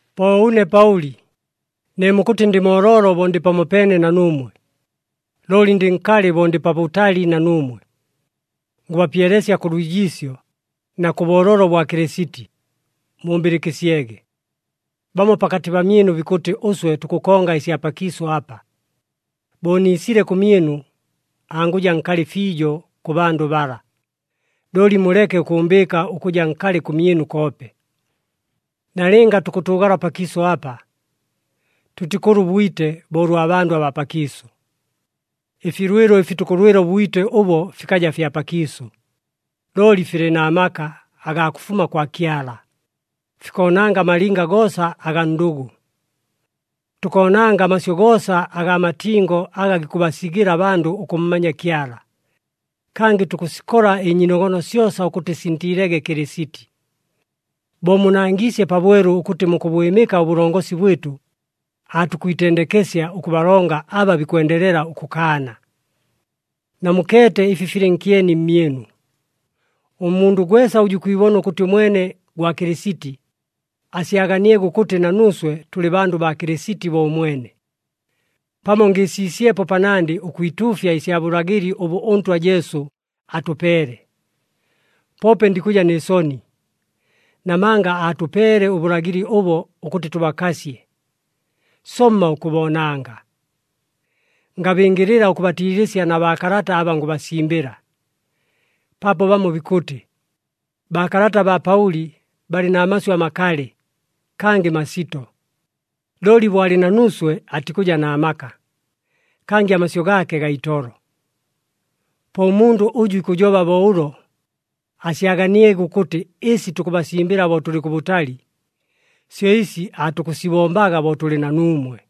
Po ʉne Paʉli, ne mukʉtɨ ndɨ mooloolo bo ndɨ pamopeene na nuumwe, looli ndɨ nkalɨ bo ndɨ pabʉtali na nuumwe, ngʉbapyelesya kʉ lwijiisyo na kʉ booloolo bwa Kɨlɨsiti, mumbɨlɨkɨsyege! Bamo pakatɨ pamyɨnu bikʉtɨ ʉswe tukʉkonga ɨsya pakiisʉ apa. Bo niisile kʉmyɨnu, angʉja nkalɨ fiijo kʉ bandʉ bala, looli muleke ʉkʉʉmbɨɨka ʉkʉja nkalɨ kʉmyɨnu koope. Nalɨnga tukʉtʉʉgala pakiisʉ apa, tʉtikʉlwa ʉbwite bo ʉlwa bandʉ abaa pakiisʉ. Ɨfilwɨlo ɨfi tukʉlwɨla ʉbwite ʉbo fikaja fya pakiisʉ, looli filɨ na maka agaa kʉfuma kwa Kyala, fikoonanga amalinga goosa agaa ndʉgʉ. Tukoonanga amasyʉ goosa agaa matingo aga gikʉbasigɨla abandʉ ʉkʉmmanya Kyala. Kangɨ tukʉsikola ɨnyiinogono syosa ʉkʉtɨ sintiilege Kɨlɨsiti. Bo munangiisye pabwelu ʉkʉtɨ mukʉbwɨmɨka ʉbʉlongosi bwɨtʉ, aatukwitendekesya ʉkʉbalonga aba bikwendelela ʉkʉkaana. Namukeete ɨfi filɨ nkyeni mmyɨnu. Ʉmundʉ gwesa ʉjʉ ikwibona ʉkʉtɨ ʉmwene gwa Kɨlɨsiti, asyaganiege ʉkʉtɨ na nuuswe tʉlɨ bandʉ baa Kɨlɨsiti bo ʉmwene. Pamo ngɨɨsiisyepo panandɨ ʉkwituufya ɨsya bʉlagɨli ʉbʉ ʉNtwa Jesu atʉpeele, poope ndikʉja nɨ soni, namanga aatʉpeele ʉbʉlagɨli ʉbo ʉkʉtɨ tʉbakasye, somma ʉkʉboonanga. Ngabɨngɨlɨla ʉkʉbatiilɨsya na baakalata aba ngʉbasimbɨla. Paapo bamo bikʉtɨ, “Baakalata baa Paʉli balɨ na masyʉ amakalɨ, kangɨ masito. Looli bo alɨ na nuuswe atikʉja na maka, kangɨ amasyʉ gaake gaa itolo.” Po ʉmundʉ ʉjʉ ikʉjoba bo ʉlo, asyaganiege ʉkʉtɨ ɨsi tukʉbasimbɨla bo tʉlɨ kʉbʉtali, syo ɨsi aatukʉsibombaga bo tʉlɨ na nuumwe.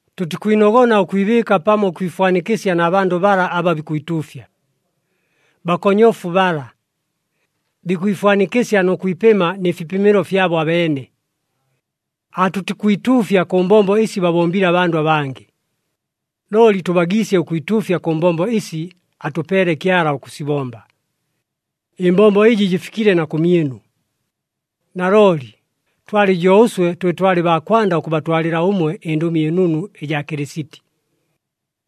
Tʉtikwinogona ʉkwibɨɨka pamo ʉkwifwanikɨsya na bandʉ bala aba bikwituufya. Bakonyofu bala! Bikwifwanikɨsya nʉ kwipɨma nɨ fipɨmɨlo fyabo abeene. Aatʉtikwituufya kʉ mbombo ɨsi babombile abandʉ abangɨ, looli tʉbagiisye ʉkwituufya kʉ mbombo ɨsi atʉpeele Kyala ʉkʉsibomba. Ɨmbombo ɨjɨ jɨfikile na kʉmyɨnu. Nalooli, twalɨ jo ʉswe twe twalɨ baa kwanda ʉkʉbatwalɨla ʉmwe ɨNdʉmi ɨNunu ɨjaa Kɨlɨsiti.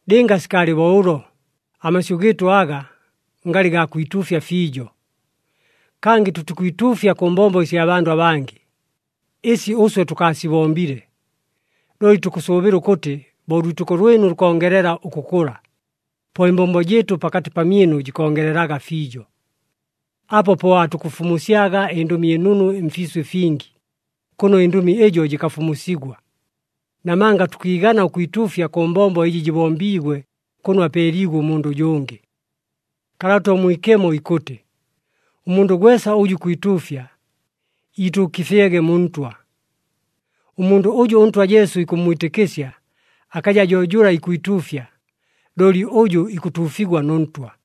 Lɨnga sikaalɨ bo ʉlo, amasyʉ gɨɨtʉ aga, ngalɨ gaa kwituufya fiijo. Kangɨ tʉtikwituufya kʉ mbombo ɨsya bandʉ abangɨ, ɨsi ʉswe tʉkaasibombile. Looli tukʉsʉʉbɨla ʉkʉtɨ bo ʉlwitɨko lwɨnu lukongelela ʉkʉkʉla, po ɨmbombo jɨɨtʉ pakatɨ pamyɨnu jikongelelaga fiijo. Apo po aatukʉfumusyaga ɨNdʉmi ɨNunu mfiisʉ ɨfingi, kʉno ɨndʉmi ɨjo jɨkafumusigwa. Namanga tʉkiigana ʉkwituufya kʉ mbombo ɨjɨ jɨbombiigwe kʉno apeeliigwe ʉmundʉ ʉjʉngɨ. Kalata ʉMwikemo ikʉtɨ, “Ʉmundʉ gwesa ʉjʉ ikwituufya, iituukɨfyege mu Ntwa.” Ʉmundʉ ʉjʉ ʉNtwa Jesu ikʉmmwitɨkɨsya, akaja jo jʉla ikwituufya, looli ʉjʉ ikʉtuufigwa nʉ Ntwa.